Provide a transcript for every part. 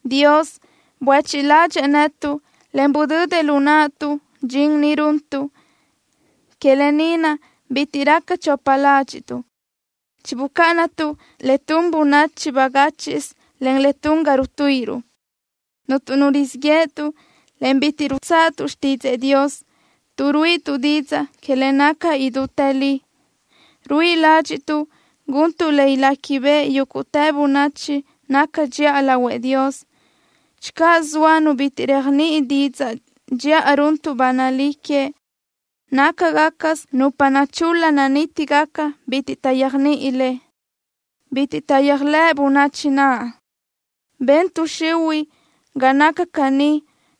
Dios buéchiʼ ládxëʼë netuʼ, en budödëʼ lu naʼtuʼ dxin ni runtuʼ. Que lë ni naʼ bitiʼ raca chopa ládxiʼtuʼ. Chibucáʼanatuʼ le tun bönachi bagáchiʼsö, en le tun ga rutuíʼiruʼ. Cuntu nu rizíʼ yéʼetuʼ, en bitiʼ rutsáʼatuʼ xtídzëʼë Dios. Tuʼ ruíʼituʼ didzaʼ que le naca idútë li, ruíʼi ládxiʼtuʼ guntuʼ le iléquibeʼe yúguʼtë bönachi naca dxiʼa lahuëʼ Dios. Channö zoa nu bitiʼ réajniʼini didzaʼ dxiʼa runtuʼ ba nalí que, nácagacasö nupa nachul-la nanítigaca bitiʼ taʼyéajniʼi le. Bitiʼ taʼyéajlëʼ bönachi naʼ. Ben tuʼ xihuiʼ ga naca caní,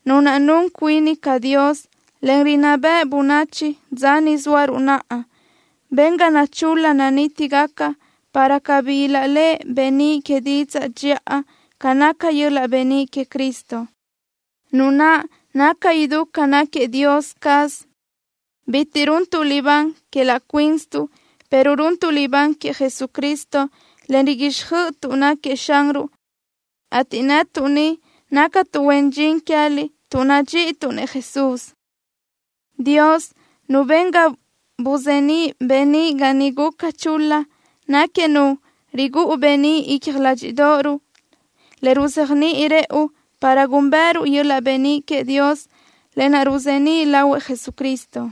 nu naʼ nun cuini ca dios, en rinná beʼe bönachi dza ni zóaruʼ naʼa. Ben ga nachul-la nanítigaca, para cabí ilaʼléʼe beníʼ que didzaʼ dxiʼa ca naca yöl-laʼ beníʼ queëʼ Cristo, Nu naʼ naca idú ca náquiëʼ Dios caz. Bitiʼ runtuʼ libán que laʼ cuínsituʼ, pero runtuʼ libán queëʼ Jesucristo, en riguíxjöʼötuʼ náquiëʼ Xanruʼ, ateʼ netuʼ ni nácatuʼ huen dxin queë́liʼ tuʼ nadxíʼituʼ-nëʼ Jesús. Dios, Nu ben ga buzeníʼ beníʼ ga niʼ guca chul-la, náquiëʼ Nu rigúʼu beníʼ icja ládxiʼdoʼoruʼ, le ruzéajniʼi rëʼu para gúnbëʼëruʼ yöl-laʼ beníʼ queëʼ Dios, lë naʼ ruzeníʼ lahuëʼ Jesucristo.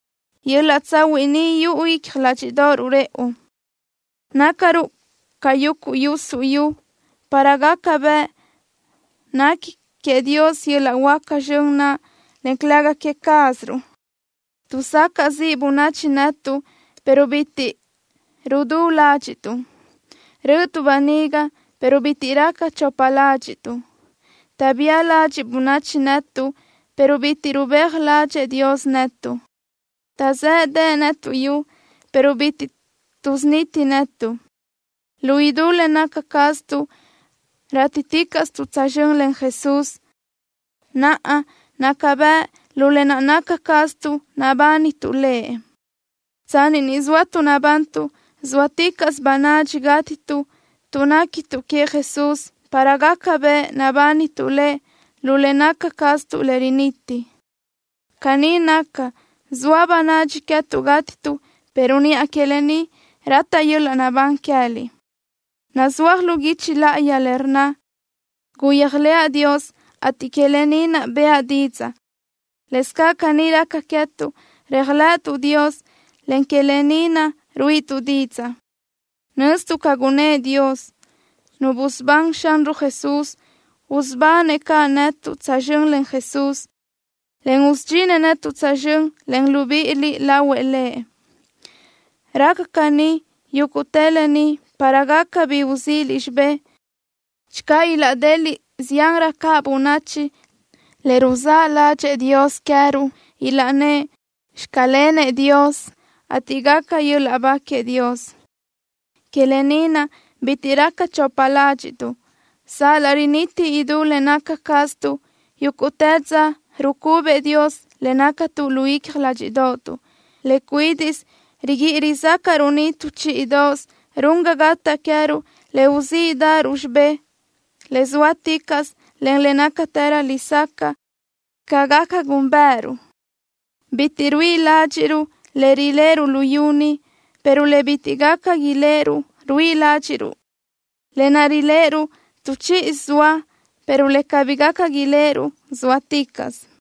Yöl-laʼ tsahuiʼ ni yuʼu icja ládxiʼdoʼoruʼ rëʼu. Nácaruʼ ca yuguʼ yusuʼ yu, para gaca bëʼ nequi queëʼ Dios yöl-laʼ huáca zxön naʼ, en calëga que cázaruʼ. Tuʼsacaʼ ziʼ bönachi netuʼ, pero bitiʼ rudú ládxiʼtuʼ. Rö́ʼötuʼ böniga, pero bitiʼ raca chopa ládxiʼtuʼ. Taʼbía ladxiʼ bönachi netuʼ, pero bitiʼ rubéaj ládxëʼë Dios netuʼ. Taʼzéʼedeʼe netuʼ yu, pero bitiʼ tuʼsuniti netuʼ. Lu idú le naca caztuʼ rátiticaʼstuʼ tsözxö́n len Jesús, naʼ naca bëʼ lu le naca caztuʼ nabánituʼ Lëʼ. Tsanni ni zóatuʼ nabantuʼ, zóaticaʼsö bönadxi gátituʼ tuʼ néquituʼ queëʼ Jesús para gaca bëʼ nabánituʼ Lëʼ lu le naca caztuʼ le riniti. Caní naca, zoa bönadxi queë́tuʼ gátituʼ, pero niʼa que lë ni rataʼ yöl-laʼ naʼbán queë́liʼ. Nazúaj lu guichi láʼayi le rnna: “Guyéajlëʼa Dios, ateʼ que lë ni naʼ bëʼa didzaʼ.” Lëscaʼ caní raca queë́tuʼ, réajlëʼëtuʼ Dios, en que lë ni naʼ ruíʼituʼ didzaʼ. Nöztuʼ ca gunëʼ Dios, Nu busubán Xanruʼ Jesús, usubanëʼ caʼ netuʼ tsözxö́n len Jesús, en usudxinëʼ netuʼ tsözxö́n len libíʼiliʼ lahuëʼ Lëʼ. Raca caní yúguʼtë lë ni para gaca bi uzíʼiliʼ xibé. Channö ilaʼdeliʼ ziánrö caʼ bönachi le ruzáʼ ládxëʼë Dios queë́ruʼ, ilaʼnnë́ʼ: “Xclenëʼ Dios”, ateʼ gaca yöl-laʼ ba queëʼ Dios. Que lë ni naʼ, bitiʼ raca chopa ládxiʼtuʼ. Sal-laʼ riniti idú le naca caztuʼ, yúguʼtë dza rucubëʼ Dios le nácatuʼ lu icja ládxiʼdoʼotuʼ. Le cuídiʼsö riguíʼi rizácaʼruʼ ni tu chíʼidoʼosö run ga gataʼ queë́ruʼ le uzíʼdaʼaruʼ xibé le sóaticaʼsö, en le nácatërö lesacaʼ ca gaca gúnbëʼëruʼ. Bitiʼ ruíʼi ládxiʼruʼ le riléʼeruʼ luyú ni, pero le bitiʼ gaca iléʼeruʼ ruíʼi ládxiʼruʼ. Lë naʼ riléʼeruʼ, tu chíʼidoʼosö zoa, pero le cabí gaca iléʼeruʼ sóaticaʼsö.